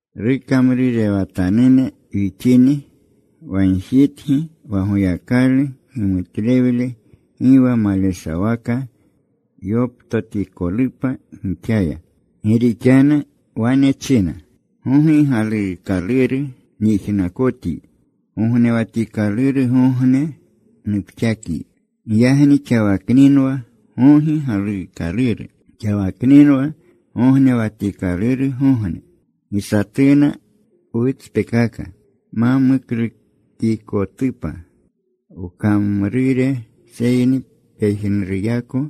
Rukamrurewatanune wixini, wagjitgi wa Goyakalu gimutlewle gi wa maleshawaka yoptotikolupa gixaya. Gi rixanu wane china: Gogi galuukaluru nyijnakotyi. Gognewatikalurgogne, nupxakyi. Giyagni xawakninwa gogi galuukaluru. Xawakninwa gognewatikalurgogne. Gi satuna wutspekaka, ma muklukikotupa wkamrure. Seyni pejnuruyako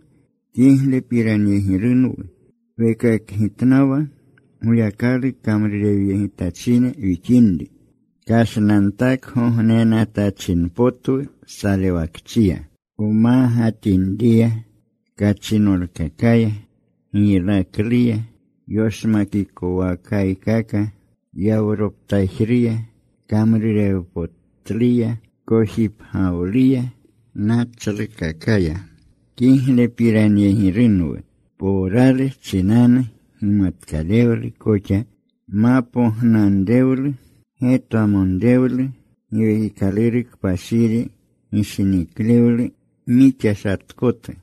kiglepiranyegirunwu wekakgitnawa Goyakalu kamrurewyegitachine wixinri, kashnantakgognenatachinpotwu salewakchiya, wmagatinriya, kachinolkakaya. Giylakluya, yoshmakikowakaykaka, yawroptajruya, kamrurewpotluya, kojipgewluya, nachlukakaya. Kiglepiranyegirunwu powrawlu chinanu, gimatkalewlu koxa, mapognanrewlu, getwamonrewlu, Giwekikaluru Kpashiri, gishiniklewlu mixashatkotu,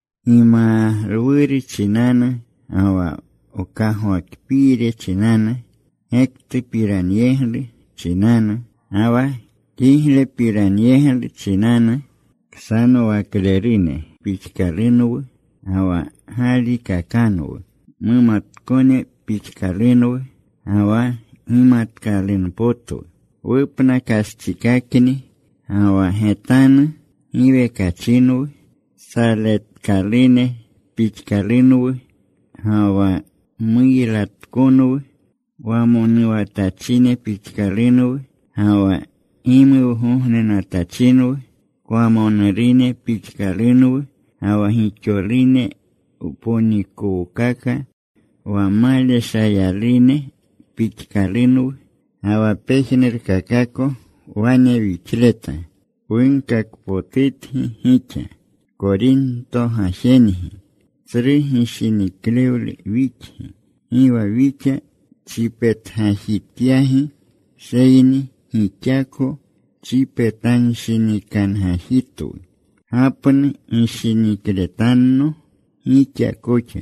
gimalwuru chinanu ga wa mkagwakpiiru chinanu, gektupiranyeglu chinanu ga wa kiglepiranyeglu chinanu. Ksanowaklerune pixkalunwu ga wa galikakanwu; mumatkone pixkalunwu ga wa gimatkalunpotwu; wupnakastsikakni ga wa getanu giwekachinwu, saletkalune pixkalunwu ga wa muylatkonwu. Wamonuwatachine pixkalunwu ga wa gimuwgognenatachinwu. Kwamonurune pixkalunwu ga wa gixolune wponikowkaka. Wa maleshayalune pixkalunwu, ga wa pejnurkakako wane wixleta. Wunkakpotutgi gixa, Korinto gajengi. Tsru gishiniklewlu wixgi. Gi wa wixa chipetgajityagi, seyni gixako chipetanshinikangajitwu. Gapnu gishinikletanno gixa koxa.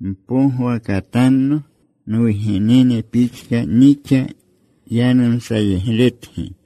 Mpogwakatanno. Nwugenene pixka nixa yanumsayegletgi.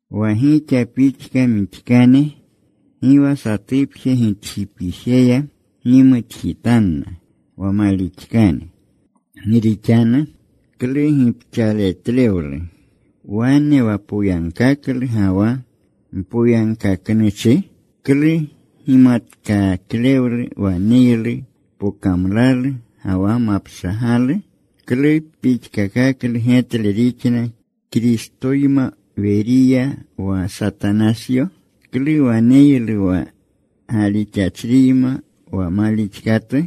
Wa gixa pixka mixkane, gi wa satupje gitjipijeya gimutjitanna, wa malixkane. Gi rixanu ¿klu gipxaletlewlu wane wa poyagkaklu ga wa mpoyagkaknuchi? ¿Klu gimatkaklewlu waneylu pokamlalu ga wa mapshagalu? ¿Klu pixkakaklu getle rixna Kristoyma Weriya, wa Satanasyo? ¿Klu waneylu wa galixachriyma wa malixkatu?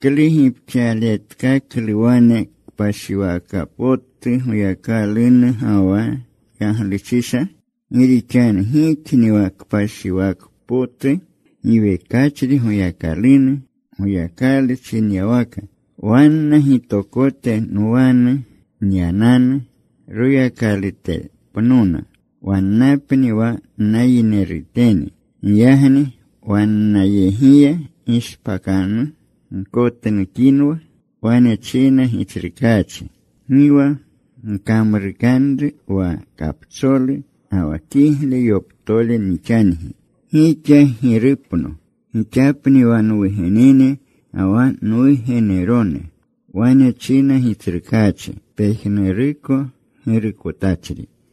¿Klu gipxaletkaklu wane kpashiwaka potu Goyakalunu ga wa yagluchisha? Gi rixanu gixni wa kpashiwaka potu giwekachri Goyakalunu. Goyakalu chinyawaka: Wanna gitokote nwanu nyananu. Royakalutepnona. Wannapni wa nayinerutene. Giyagni, “Wannayegiya gishpakanu. Gkotnukinwa.” Wane china Gitsrukaachi: “Gi wa gkamrukanru wa kapcholu ga wa kigle yoptole nixangi.” “Gixa Girupno. Gixapni wa nwugenene ga wa nwugenerone.” Wane china Gitsrukaachi, pejnuruko Girukotachri.